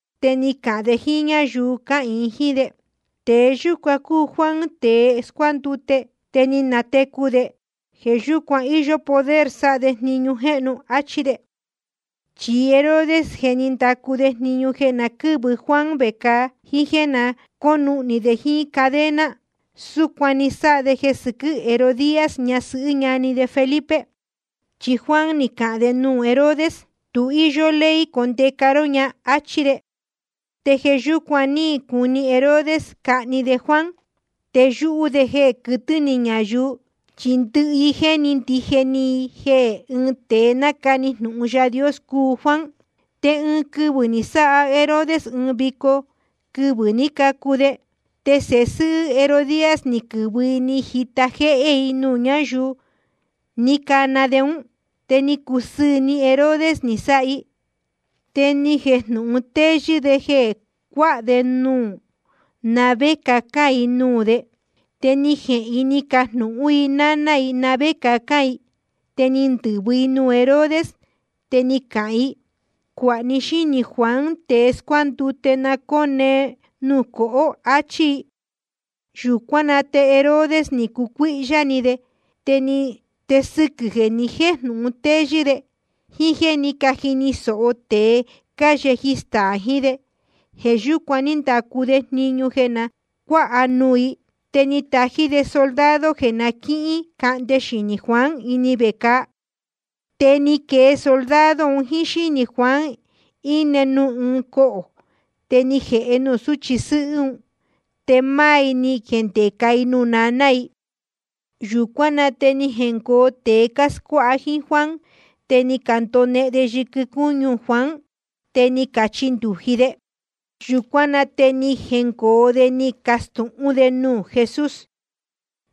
Te ni cahān de jíín ñáyuu cáhīin jíín de: Tēe yúcuan cúu Juan tēe ni scuándute, te ni natecu de. Jeē yúcuan íyó poder de sáha de jniñu jéhnu. Achí de. Chi Herodes, je ni ndacu de jniñu jeē na quɨ́vɨ Juan vecāa, jíín jéē na cónuhnī de jíín cadena. Súcuan ni sáha de jeē sɨquɨ́ Herodías, ñasɨhɨ́ ñani de Felipe. Chi Juan ni cahān de nuū Herodes: Tu íyó ley condeca ró ña, áchí de. Te jeē yúcuan ní cuni Herodes cahni de Juan. Te yúhú de jeē quɨtɨ̄ ni ñayuu, chi ndɨhɨ i jéni ndije ni i jeē ɨɨn tēe nácani jnūhun Yaā Dios cúu Juan. Te ɨɨn quɨvɨ̄ ni sáha Herodes ɨɨn vico quɨvɨ̄ ní cacu de. Te sēhe sɨ́hɨ́ Herodías ni quɨ̄vɨ i ni jita jéhé i nuū ñáyuu ní cana de ún. Te ni cusɨɨ̄ ni Herodes ni sáha i. Te ni jejnūhun téyɨ́ de jeē cuáha de núu na vé cacān i nuū de. Te ni jehēn i ni cajnūhún i náná i na vé cacān i. Te ni ndɨ̄vɨ i nuū Herodes, te ni cahān i: Cuāha ní xínī Juan tēe scuándute, cone nuū ɨɨn cohō, achí i. Yūcuán na te rey Herodes ni cucuíhyá ni de. Te sɨquɨ̄ jeē ni jéjnūhun téyɨ́ de, jíín jéē ní cajini sōho tēe cáyeji staā jiín de, jeē yúcuan ní ndacu de jniñu jeē na cuáha nuū i. Te ni tají de soldado jeē na quícahnde xinī Juan ini vecāa. Te ni quee soldado un jíín xínī Juan, íne nuū ɨɨn cohō, te ni jēhe nuū súchi sɨ́hɨ́ un. Te máá i ni jendeca i nuū naná i. Yūcuán na te ni jengoo tēe cáscuáha jíín Juan, te ni candonehen de yɨquɨ cúñu Juan, te ni cachindūji de. Yūcuán na te ni jengoo de ni cacastūhún de nuū Jesús.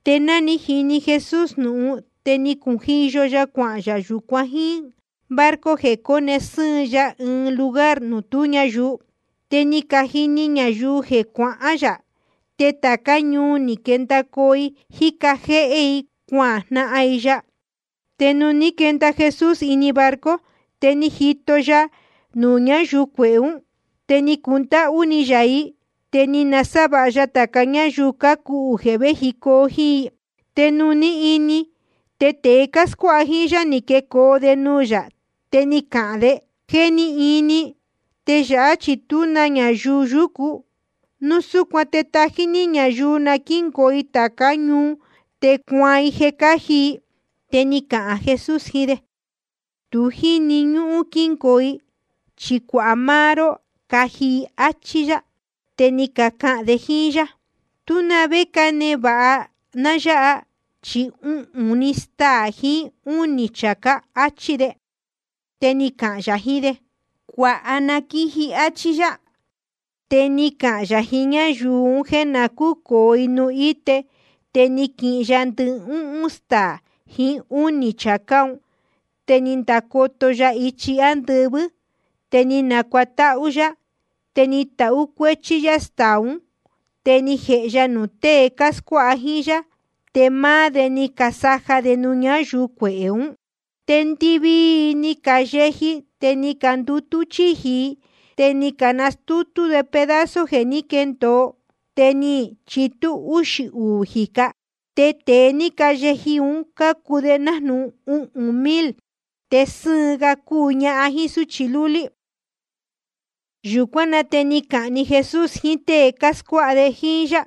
Te ná ni jini Jesús jnūhun, te ni cujiyo ya yūcuan cuáhān yā jiín barco, jeē cóne sɨ́ɨn ya ɨɨn lugar nuū tú ñayuu. Te ni cajini ñayuu jeē cuahán yā. Te tācá ñuu ni quendacoo i cájica jéhé i, cuajnahan i ya. Te nuū ní quenda Jesús ini barco, te ni jito ya ñayuu cuehē ún. Te ni cundáhú ni yā i, te ni nasávāha ya tāca ñáyuu cácuhū jeē véjicoo i jíín. Te nuū ní ini, te tēe cáscuáha jíín yá, ni quecoo de nuū yā, te ni cacahān de: Je ni ini, te yāhá chi tú na ñayuu yúcu. Núu súcuan te tají ní ñayuu na quíngoo i tācá ñuu, te cuaan i jeē cáji i. Te ni cahān Jesús jiín de: Tu jíni ñúhún quíngoo i, chi cuāha máá ró jeē cáji i, áchí yá. Te ni cacahān de jíín yá: Tú na vé cánevāha ná yáha, chi uhūn‑ni staā jiín úū‑ni chācá, áchí de. Te ni cahān yā jiín de: Cuāha na quíji, áchí yá. Te ni cahān yā jiín ñáyuu un jéē na cúcōo i nuū íte. Te ni quihin ya ndɨhúhún staā jiín úū chācá un. Te ni ndacoto ya ichi ándɨvɨ́, te ni nacuatáhú yá. Te ni tahú cuéchí yá staā ún, te ni jēhe ya nuū tée cáscuáha jíín yá. Te máá de ni casaja de nuū ñáyuu cuehē ún. Te ndɨvii i ni cayeji, te ni candutú chíji i. Te ni canastútú de pedazo jeē ní quendōo, te ni chitú úxī uū jīca. Te tēe ni cayeji un cúu nájnūhun uhūn mil, te sɨ́ɨn ga cúu ñahan jíín súchi lúlí. Yūcuán na te ni cahān‑ni Jesús jiín tée cáscuáha jíín yá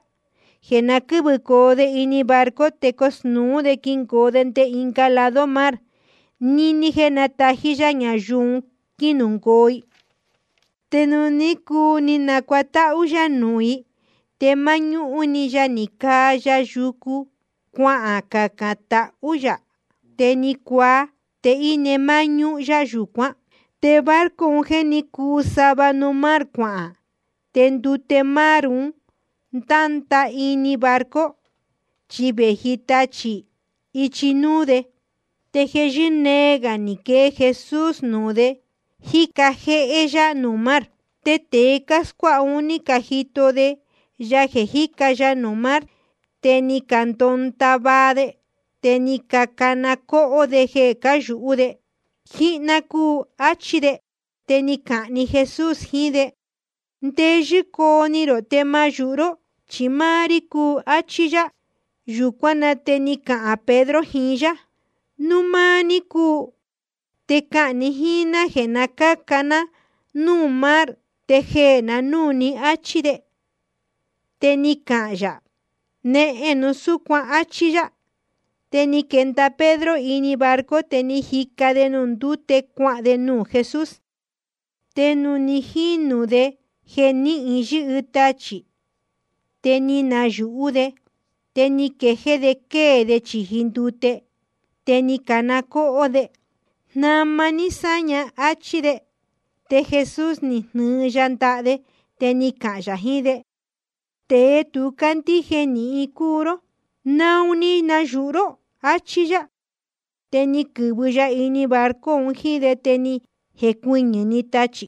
jeē na quɨ́vɨcoo de barco, te cosnūú de quingoo de nde ɨnga lado mar, níní jéē nátají yá ñayuu un quínungoo i. Te nuū ní cuu ni nacuatáhú yá nuū i, te máñúhún‑ni ya ni caa ya yucu, cuacacān tahú yā. Te ni cuaa, te íne máñúhún yá yūcuán. Te barco un, je ni cuu sava nuū mar cuahān. Te ndute mar un nátundahá níhin barco, chi vēji tachī ichi núú de. Te jeē yɨ́nee gā ni quee Jesús nuū de, jíca jéhé yá nuū mar. Te tēe cáscuáha ún, ni cajito de ya jeē jíca ya nuū mar. Te ni candondava de, te ni cacana cóhó de jeē cáyūhú de. Jíhná cúu, áchí de. Te ni cahān‑ni Jesús jiín de: Ndeyɨ́ coo ni rō, te ma yūhu ró, chi máá rí cúu, áchí yá. Yūcuán na te ni cahān Pedro jiín yá: Núu máá ní cúu, te cahān ni jíín ná jéē na cáca jéhé ná nuū mar te jeē na núū ní, áchí de. Te ni cahān yā: Nehen núu súcuan, áchí yá. Te ni quenda Pedro ini barco, te ni jica de nuū ndúte cuahān de nuū Jesús. Te nuū ní jini de jeē níhin yɨ́hɨ tachī, te ni yūhú de. Te ni quejéé de quée de chīji ndute. Te ni cana cóhó de: Jnama ní sáña, áchí de. Te Jesús ni jnɨɨ‑ni ya ndaha de. Te ni cahān yā jiín de: Tēe tu cándíje nīhin cúu ró. ¿Naun ni nayūhu ró? Achí yá. Te ni quɨ̄vɨ ya ini barco un jíín de, te ni jecuɨñɨ̄‑ni tachī.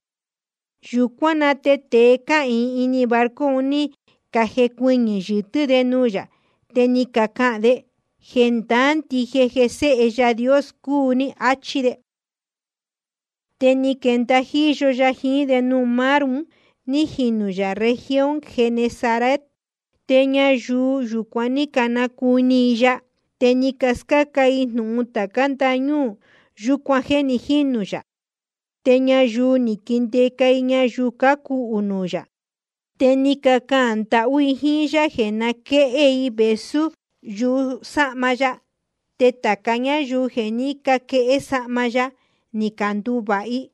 Yūcuán na te tēe cáhīin ini barco un, ni cajecuɨñɨ̄ yɨtɨ́ de nuū yā. Te ni cacahān de: Jendaá ndije jeē Sēhe Yaā Dios cúu ní, áchí de. Te ni quenda jíyo ya jiín de nuū mar un, ní jinū yā región Genesaret. Te ñayuu yūcuan ní canacuni i ya. Te ni cascáca i jnūhun tācá ndañúū yūcuan jéē ni jínū yā. Te ñayuu ni caquindeca i ñayuu cácuhū nuū yā. Te ni cacahān ndahú i jíín yá jeē na quéhé i vēsú yusáhma ya. Te tāca ñáyuu jeē ní caquehé sahma ya, ni canduvāha i.